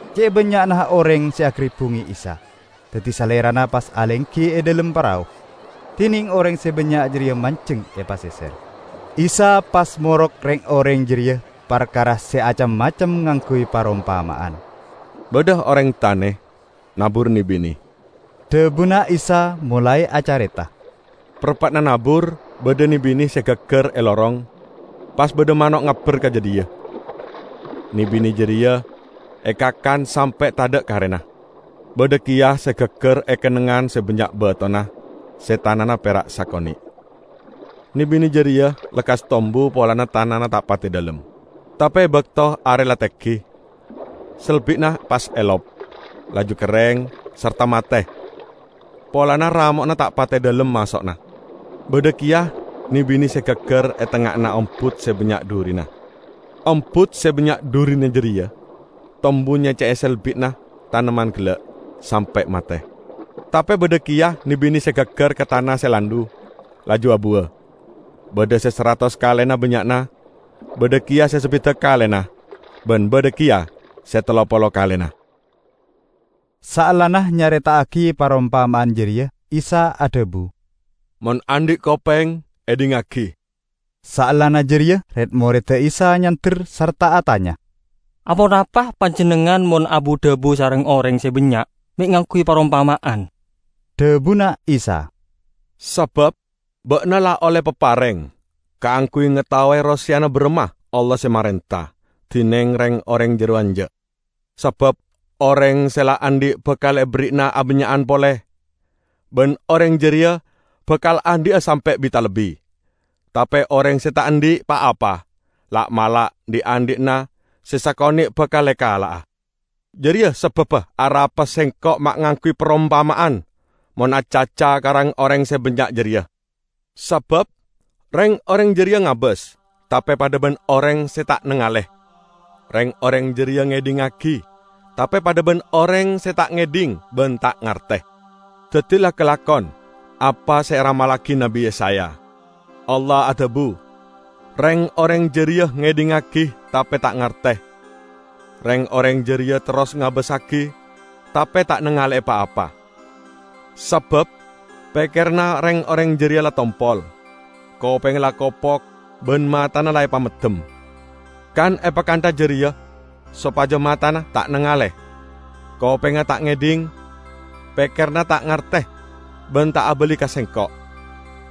Ce' bannya'na oreng se agaribbunge Isa, daddi Salerana pas alenggi e dhalem parao, dineng oreng se bannya' jareya manjeng e paseser. Isa pas morok reng-oreng jareya parkara se acem-macem ngangguy parompama'an. "Badha oreng tane nabur ne-bine," dhabuna Isa molae acareta. "Parappa'na nabur, badha ne-bine se gaggar e lorong. Pas badha mano' ngabber ka jadhiya, ne-bine jareya ekakan sampe' tadha' karena. Badha keya se gaggar e kennengngan se bannya' batona, se tanana pera' sakone'. Ne-bine jareya lekkas tombu polana tanana ta' pate dhalem. Tape e bakto are la tenggi, selbi'na pas elop, laju kerreng sarta mate polana ramo'na ta' pate dhalem maso'na. Badha keya ne-bine se gaggar e tengnga'anna ombut se bannya' dhurina. Ombut se bannya' dhurina jareya tombu nyecce'e selbi'na tamennan gella' sampe' mate. Tape badha keya ne-bine se gaggar ka tana se landhu, laju abuwa; badha se saratos kalena bannya'na, badha keya se sabidak kalena ban badha keya se tello polo kalena." Saellana nyareta'agi parompama'an jareya Isa adhabu, "Mon andhi' kopeng, edhingngagi!" Saellana jareya red-moredda Isa nyander sarta atanya, "Aponapa Panjennengngan mon abu-dhabu sareng oreng se bannya' me' ngangguy parompama'an?" Dhabuna Isa, "Sabab ba'na la olle papareng kaangguy ngataowe roseyana baramma Allah se marenta, dineng reng-oreng jarowa enja'. Sabab oreng se la andhi' bakal eberri'ana abannya'an pole, ban oreng jareya bakal andhi'a sampe' bi-talebbi. Tape oreng se ta' andhi' pa-apa, la'-mala' dhi'-andhi'na se sakone' bakal ekala'a. Jareya sababba arapa Sengko' ma' ngangguy parompama'an mon acaca ka oreng se bannya' jareya, sabab reng-oreng jareya ngabas, tape padha ban oreng se ta' nangale; reng-oreng jareya ngedhingngagi, tape padha ban oreng se ta' ngedhing ban ta' ngarte. Daddi la kalakon apa se eramallagi Nabbi Yesaya: 'Allah adhabu: Reng-oreng jareya ngedhingngagi tape ta' ngarte; reng-oreng jareya terros ngabassagi tape ta' nangale'e pa-apa. Sabab pekkeranna reng-oreng jareya la tompol, kopengnga la kopok ban matana la epameddem. Kan epakantha jareya sopaja matana ta' nangale, kopengnga ta' ngedhing, pekkeranna ta' ngarte ban ta' abali ka Sengko',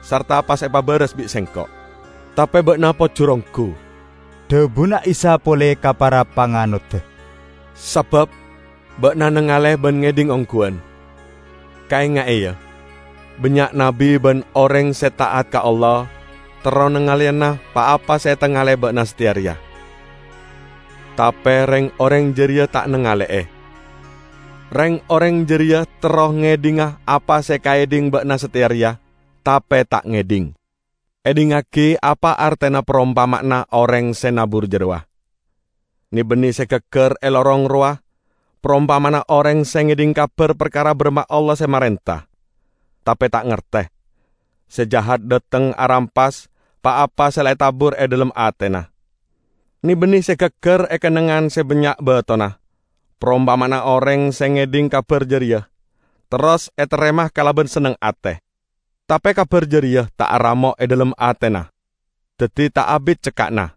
sarta pas epabaras bi' Sengko'.' " "Tape ba'na pojur onggu," dhabuna Isa pole ka para panganodda, "sabab ba'na nangale ban ngedhing ongguwan. Kaenga'e, ya, bannya' nabbi ban oreng se ta'at ka Allah terro nangaleyana pa-apa se etangale'e ba'na sateya reya, tape reng-oreng jareya ta' nangale'e. Reng-oreng jareya terro ngedhinga apa se ekaedhing ba'na sateya reya, tape ta' ngedhing." "Edhingngagi apa artena parompama'anna oreng se nabur jarowa. Ne-bine se gaggar e lorong rowa parompama'anna oreng se ngedhing kabar parkara baramma Allah se marenta, tape ta' ngarte. Se Jahat dhateng arampas pa-apa se la etabur e dhalem atena. Ne-bine se gaggar e kennengngan se bannya' batona, parompama'anna oreng se ngedhing kabar jareya, terros etarema kalaban senneng ate. Tape kabar jareya ta' aramo' e dhalem atena, daddi ta' abit cekka'na.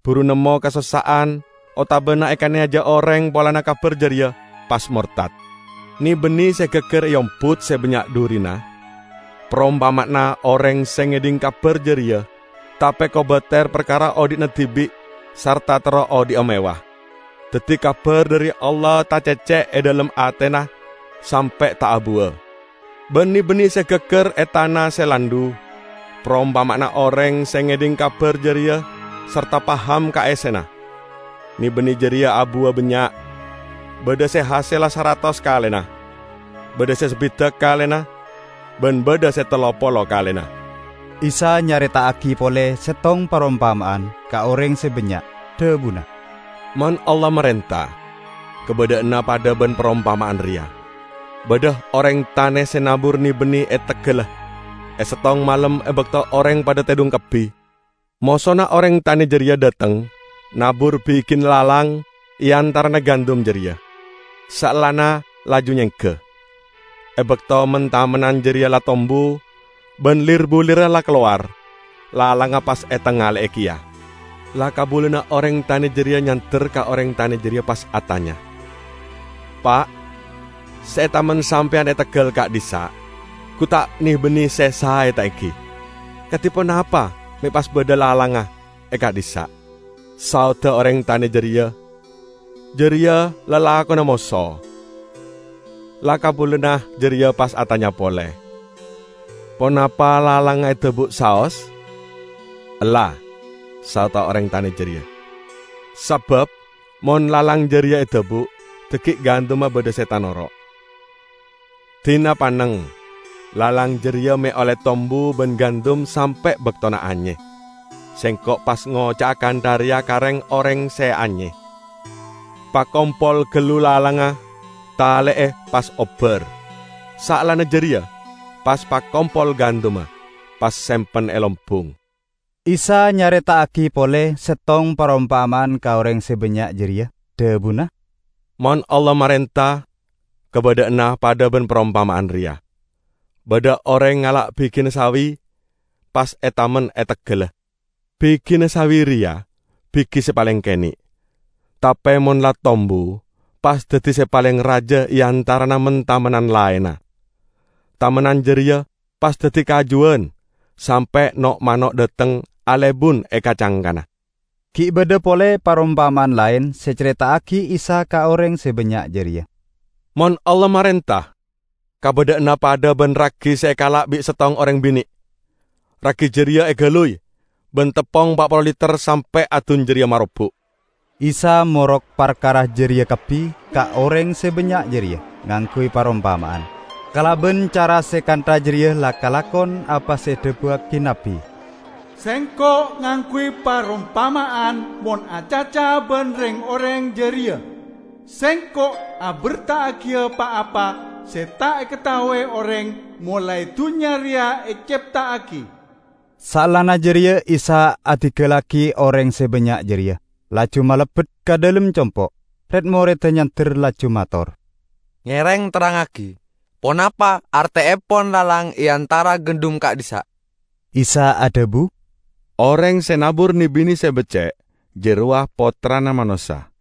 Buru nemmo kasossa'an otabana ekaneyaja oreng polana kabar jareya, pas mortad. Ne-bine se gaggar e ombut se bannya' dhurina parompama'anna oreng se ngedhing kabar jareya, tape kobater parkara odhi'na dibi' sarta terro odhi'a mewah. Daddi kabar dhari Allah tacecce' e dhalem atena sampe' ta' abuwa. Ban ne-bine se gaggar e tana se landhu parompama'anna oreng se ngedhing kabar jareya sarta paham ka essena. Ne-bine jareya abuwa bannya', badha se hasella saratos kalena, badha se sabidak kalena, ban badha se tello polo kalena." Isa nyareta'agi pole settong parompama'an ka oreng se bannya', dhabuna, "Mon Allah marenta, kabadha'anna padha ban parompama'an reya: Badha oreng tane se nabur ne-bine e teggalla. E settong malem, e bakto oreng padha tedhung kabbi, mosona oreng tane jareya dhateng nabur bigina lalang e antarana gandum jareya, saellana laju nyengga. E bakto men-tamennan jareya la tombu ban lir-bulirra la kalowar, lalangnga pas etangale'e keya. La-kabulana oreng tane jareya nyander ka oreng tane jareya pas atanya, 'Pa', se etamen sampeyan e teggal ka'dhissa' gu ta' ne-bine se sae, ta' enggi? Kadi ponapa me' pas badha lalangnga e ka'dhissa'?' Saodda oreng tane jareya, 'Jareya lalakonna moso.' La-kabulana jareya pas atanya pole, 'Ponapa lalangnga edabu'a saos?' 'Ella,' saodda oreng tane jareya, 'sabab mon lalang jareya edabu', dhaggi' gandumma badha se tanoro'. Dina panneng lalang jareya me' olle tombu ban gandum sampe' baktona anye. Sengko' pas ngoca'a kantha reya ka reng-oreng se anye: Pakompol gallu lalangnga, tale'e, pas obbar. Saellana jareya pas pakompol gandumma, pas sempen e lombung.' " Isa nyareta'agi pole settong parompama'an ka oreng se bannya' jareya, dhabuna, "Mon Allah marenta, kabadha'anna padha ban parompama'an reya: Badha oreng ngala' bigina sawi, pas etamen e teggalla. Bigina sawi reya bigi se paleng kene'. Tape mon la tombu, pas daddi se paleng raja e antarana men-tamennan laenna. Tamennan jareya pas daddi kajuwan, sampe' no'-mano' dhateng alebun e ka-cangkana." Gi' badha pole parompama'an laen se ecareta'agi Isa ka oreng se bannya' jareya. "Mon Allah marenta, kabadha'anna padha ban ragi se ekala' bi' settong oreng bine'; ragi jareya egaluy ban teppong pa' polo liter sampe' adun jareya marobuk!" Isa morok parkara jareya kabbi ka oreng se bannya' jareya ngangguy parompama'an. Kalaban cara se kantha jareya la kalakon apa se edhabuwagi nabbi, "Sengko' ngangguy parompama'an mon acaca ban reng-oreng jareya; Sengko' aberta'agiya pa-apa se ta' ekataowe oreng molae dunnya reya ecepta'agi." Saellana jareya Isa adinggallagi oreng se bannya' jareya, laju malebbet ka dhalem compo'. Red-moredda nyander, laju mator, "Ngereng terrangngagi ponapa arteepon lalang e antara gandum ka'dhissa'." Isa adhabu, "Oreng se nabur ne-bine se becce' jarowa Pottrana Manossa.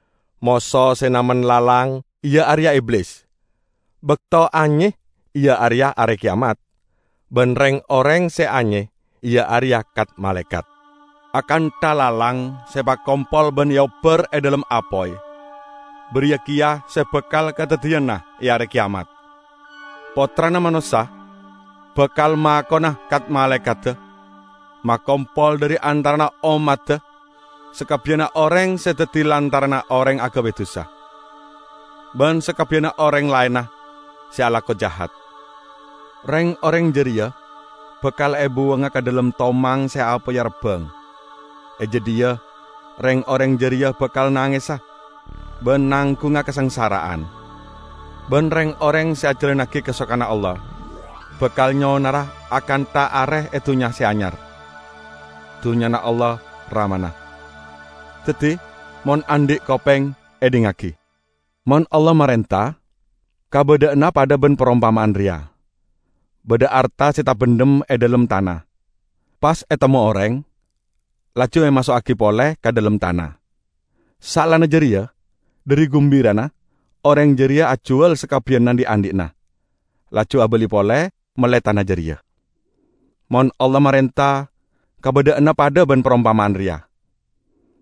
Moso se namen lalang iya areya Iblis. Bakto anye iya areya Are Keyamat, ban reng-oreng se anye iya areya kat-malaekat. Akantha lalang se epakompol ban eobbar e dhalem apoy, bariya keya se bakal kadaddiyana e Are Keyamat. Pottrana Manossa bakal makona kat-malaekadda makompol dhari antarana ommadda sakabbiyanna oreng se daddi lantaranna oreng agabay dusa, ban sakabbiyanna oreng laenna se alako jahat. Reng-oreng jareya bakal ebuwanga ka dhalem tomang se apoyya rabbang; e jadhiya reng-oreng jareya bakal nangesa ban nanggunga kasangsara'an. Ban reng-oreng se ajalannagi kasokanna Allah bakal nyonara akantha are e Dunnya Se Anyar, Dunnyana Allah, Ramana. Daddi, mon andhi' kopeng, edhingngagi!" "Mon Allah marenta, kabadha'anna padha ban parompama'an reya: badha arta se tabendhem e dhalem tana, pas etemmo oreng, laju emaso'agi pole ka dhalem tana. Saellana jareya, dhari gumbirana, oreng jareya ajuwal sakabbiyanna dhi'-andhi'na, laju abali pole, melle tana jareya." "Mon Allah marenta, kabadha'anna padha ban parompama'an reya: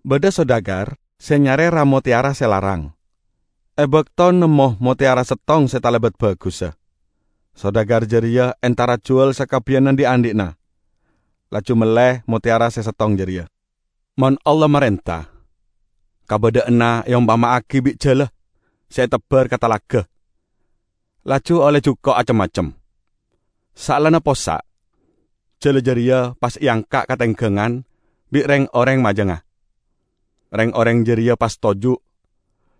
Badha sodagar se nyare ra-motteyara se larang. E bakto nemmo motteyara settong se talebat bagussa, sodagar jareya entar ajuwal sakabbiyanna dhi'-andhi'na, laju melle motteyara se settong jareya." "Mon Allah marenta, kabadha'anna eompama'agi bi' jala se etebbar ka talaga, laju olle juko' acem-macem. Saellana possa', jala jareya pas eangka' ka tenggangan bi' reng-oreng majangnga. Reng-oreng jareya pas toju',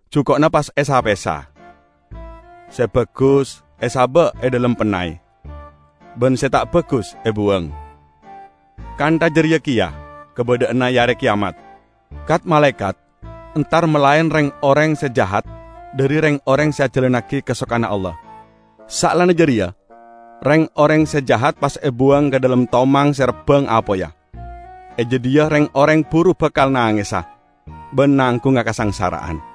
juko'na pas esa-pesa: se bagus esaba' e dhalem pennay ban se ta' bagus ebuwang. Kantha jareya keya kabadha'anna e Are Keyamat, kat-malaekat entar malaen reng-oreng se jahat dhari reng-oreng se ajalannagi kasokanna Allah. Saellana jareya reng-oreng se jahat pas ebuwang ka dhalem tomang se rabbang apoyya. E jadhiya reng-oreng buru bakal nangesa ban nanggunga kasangsara'an."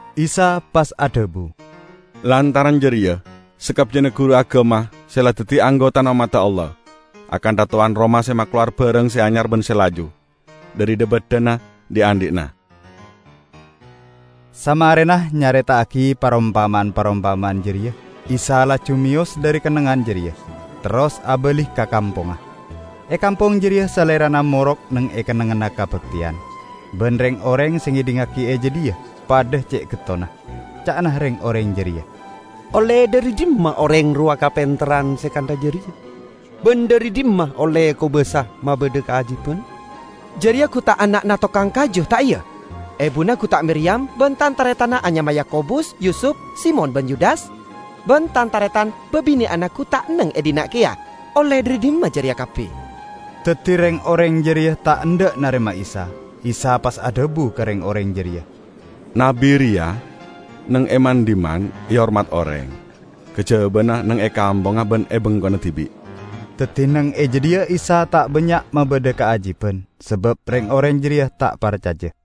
Isa pas adhabu, "Lantaran jareya, sakabbiyanna guru agama se la daddi anggotana ommadda Allah, akantha towan roma se makalowar barang se anyar ban se laju dhari dha-baddhana dhi'-andhi'na." Samarena nyareta'agi parompama'an-parompama'an jareya, Isa laju meyos dhari kennengngan jareya, terros abali ka kampongnga. E kampong jareya Salerana morok neng e kennengnganna kabakteyan, ban reng-oreng se ngedhingngagi e jadhiya padha ce' gettonna. Ca'na reng-oreng jareya, "Olle dhari dhimma oreng rowa kapenterran se kantha jareya? Ban dhari dhimma olle kobasa mabadha kaajiban? Jareya gu ta' ana'na tokang kaju, ta' iya? Ebuna gu ta' Miriyam, ban tan-taretanna anyama Yakobus, Yusup, Simon ban Yudas? Ban tan-taretan babine'anna gu ta' enneng e dhinna' keya? Olle dhari dhimma jareya kabbi?" Daddi reng-oreng jareya ta' endha' narema Isa. Isa pas adhabu ka reng-oreng jareya, "Nabbi reya neng e man-dhimman ehormat oreng, kajabana neng e kampongnga ban e bengkona dibi'." Daddi neng e jadhiya Isa ta' bannya' mabadha kaajiban sabab reng-oreng jareya ta' parcaja.